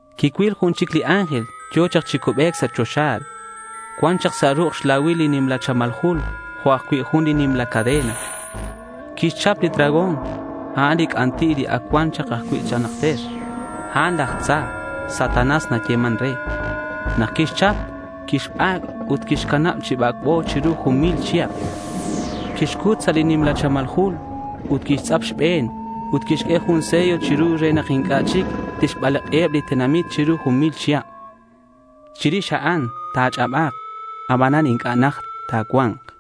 Quicuil jun chic li ángel yo̱ chak chi cubec sa' choxa. Cuan chak sa' ruk' xlauhil li nimla chamal jul jo' ajcui' jun li nimla cadena. Quixchap li dragón. A'an li c'anti' li ac cuan ajcui' chak najter. A'an laj tza. Satanás nayeman re. Nak quixchap, quixbac' ut quixcanab chi bac'bo chiru jun mil chihab. Quixcut sa' li nimla chamal jul ut quixtz'ap xbe̱n ut quixq'ue jun sello chiru re nak inc'a' chic tixbalak'iheb li tenamit chiru li jun mil chihab. Chirix a'an ta̱ach'aba̱k. Abanan inc'a' najt ta̱cua̱nk.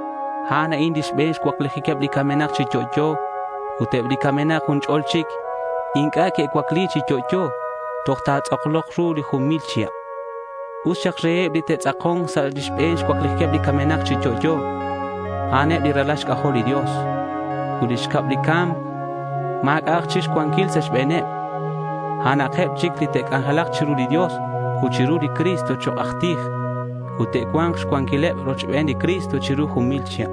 A'an a'in li xbe̱n cuaclijiqueb li camenak chi yo'yo. Ut eb li camenak jun ch'ol chic inc'a' que'cuacli chi yo'yo toj ta̱tz'aklok ru li jun mil chihab. Us xak reheb li te'tz'ako̱nk sa' li xbe̱n cuaclijiqueb li camenak chi yo'yo. A'aneb li ralal xc'ajol li Dios. Ut lix cab li ca̱mc, ma̱c'a'ak chic xcuanquil sa' xbe̱neb. A'anakeb chic li te'c'anjelak chiru li Dios ut chiru li Cristo chok' aj tij. Ut te'cua̱nk xcuanquileb rochben li Cristo chiru jun mil chihab.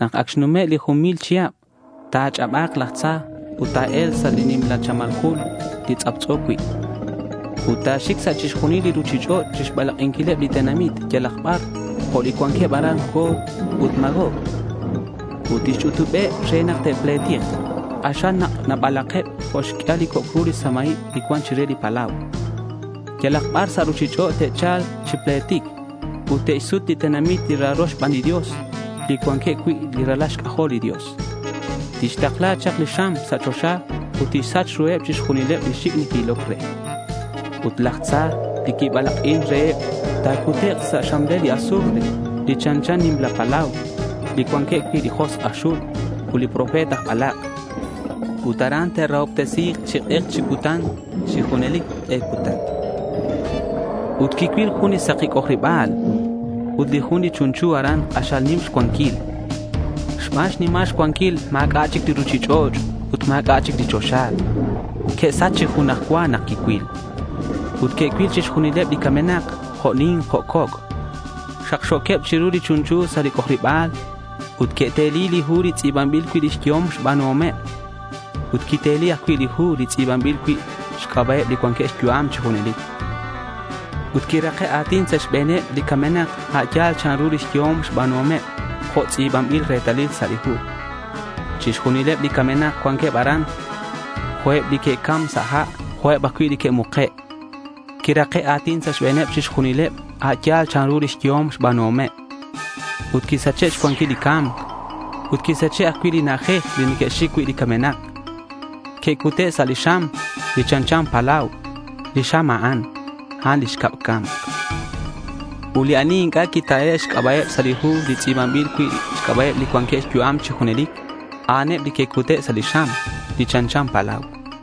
Nak acak xnume' li jun mil chihab, ta̱ach'aba̱k laj tza ut ta̱e̱lk sa' li nimla chamal jul li tz'aptz'o cui'. Ut ta̱xic sa' chixjunil li ruchich'och' chixbalak'inquileb li tenamit yalak bar jo' li cuanqueb aran Gog ut Magog. Ut tixch'utubeb re nak te'pletik. K'axal nabalakeb jo' xq'uial li coc' ru li samaib li cuan chire li palau. Yalak bar sa' ruchich'och' te'cha̱lk chi pletic ut te'xsut li tenamit li raro xban li Dios li cuanqueb cui' li ralal xc'ajol. Li Dios tixtakla chak li xam sa' choxa ut tixsach ruheb chixjunileb li xic' neque'iloc re. Ut laj tza li quibalak'in reheb ta̱cutek' sa' xxamlel li azufre li chanchan nimla palau li cuanqueb cui' li josk' aj xul ut li profeta aj balak'. Ut aran te'rahobtesi̱k chi k'ek chi cutan chi junelic k'e cutan. Ut quicuil jun li saki c'ojariba̱l. Ut li Jun li chunchu aran k'axal nim xcuanquil. Xban xnimal xcuanquil, ma̱c'a' chic li ruchich'och' ut ma̱c'a' chic li choxa. Que'sach chi junaj cua nak quicuil. Ut que'cuil chixjunileb li camenak, jo' ni̱nk jo' coc', xakxo̱queb chiru li chunchu sa' li c'ojariba̱l. Ut que'teli li hu li tz'i̱banbil cui' lix yehom xba̱nuhomeb. Ut quitehe' ajcui' li hu li tz'i̱banbil cui' xc'aba'eb li cuanqueb xyu'am chi junelic. Ut quirake' a̱tin sa' xbe̱neb li camenak a' yal chanru lix yehom xba̱nuhomeb jo' tz'i̱banbil retalil sa' li hu. Chixjunileb li camenak cuanqueb aran, jo' eb li que'cam sa' ha' jo'queb ajcui' li que'muke'. Quirake' a̱tin sa' xbe̱neb chixjunileb a' yal chanru lix yehom xba̱nuhomeb. Ut quisache' xcuanquil li ca̱mc, ut quisache' ajcui' li na'ajej li neque'xic cui' li camenak. Que'cute' sa' li xam li chanchan palau. Li xam a'an, a'an li xcab ca̱mc. Ut li ani inc'a' quita'e' xc'aba'eb sa' li hu li tz'i̱banbil cui' xc'aba'eb li cuanqueb xyu'am chi junelic, a'aneb li que'cute' sa' li xam li chanchan palau.